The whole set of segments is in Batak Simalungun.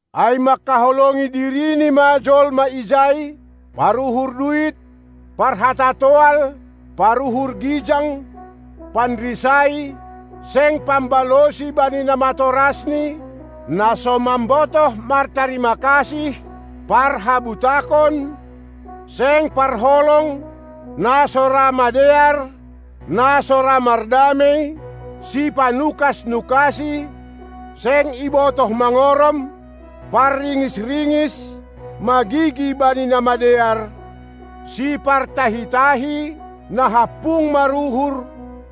Ai manghaholongi dirini ma jolma ijai, paruhur duit, parhata toal, paruhur gijang, panrisai, seng pambalosi bani na matorasni, na so mambotoh martarima kasih, parhabutakon, seng parholong, na so ra madear, na so ra mardamei, si panukas-nukasi, seng ibotoh mangorom, parringis-ringis, magigi bani na madear, sipartahi-tahi, na hampung maruhur,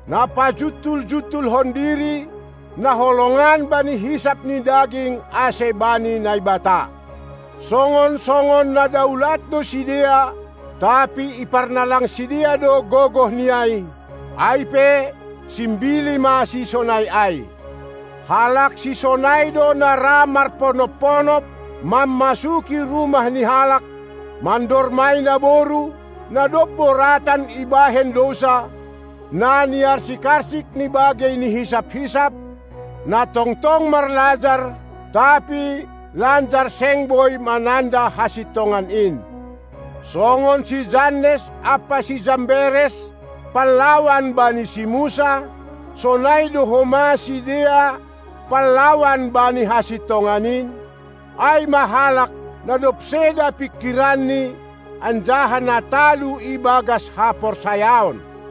na pajuntul-juntulhon diri, na holongan bani hisap ni daging ase bani Naibata. Songon-songon na daulat do sidea, tapi iparnalang sidea do gogoh ni ai. Ai pe simbili ma sisonai ai. Halak sisonai do na ra marponop-ponop mammasuki rumah ni halak, mandormai naboru, na dob boratan ibahen dousa, na niarsik-arsik ni bagei ni hisap-hisap, na tongtong marlajar, tapi lanjar seng boi mananda hasintongan in. Songon si Jannes ampa si Jamberes panlawan bani si Musa, sonai do homa sidea panlawan bani hasintongan in, ai ma halak, na dob seda pingkiranni anjaha na talu ibagas haporsayaon.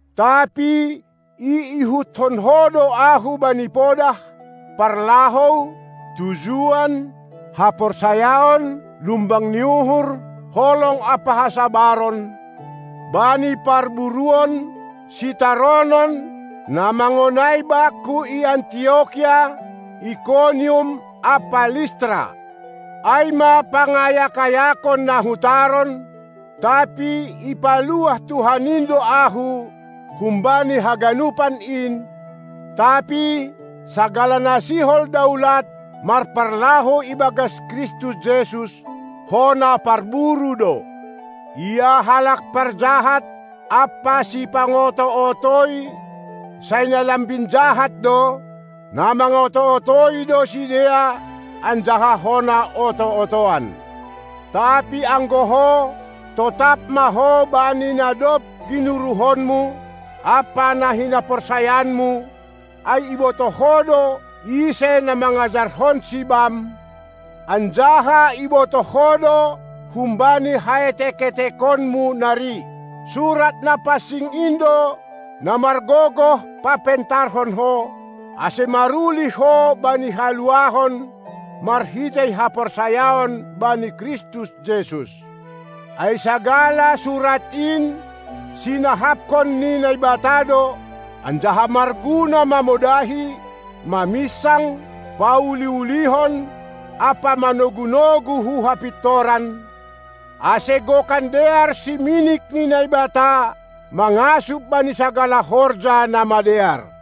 Tapi iihuthon ho do ahu bani podah, parlahou, tujuan, haporsayaon lumbang ni uhur, holong ampa hasabaron, bani parburuon, sitaronon, na mangonai bakku i Antiokia, Ikonium ampa Listra. Ai ma pangayak-ayakon na hutaron, tapi ipaluah Tuhan in do ahu humbani haganupan in, Tapi sagala na sihol daulat marparlahou ibagas Kristus Jesus, hona parburu do. Ia halak parjahat ampa sipangoto-otoi sai na lambin jahat do; na mangoto-otoi do sidea anjaha hona oto-otoan. Tapi anggo ho, totap ma ho bani na dob ginuruhonmu ampa na hinaporsayaanmu, ai ibotoh ho do ise na mangajarhonsi bam, anjaha ibotoh ho do humbani haetek-etekonmu nari, Surat na pansing in do, na margogoh papentarhon ho, ase marulih ho bani haluahon marhitei haporsayaon bani Kristus Jesus. Ai sagala Surat in sinahapkon ni Naibata do, anjaha marguna mamodahi, maminsang, pauli-ulihon ampa manogu-nogu hu hapintoran, ase gokan dear siminik ni Naibata, mangasup bani sagala horja na madear.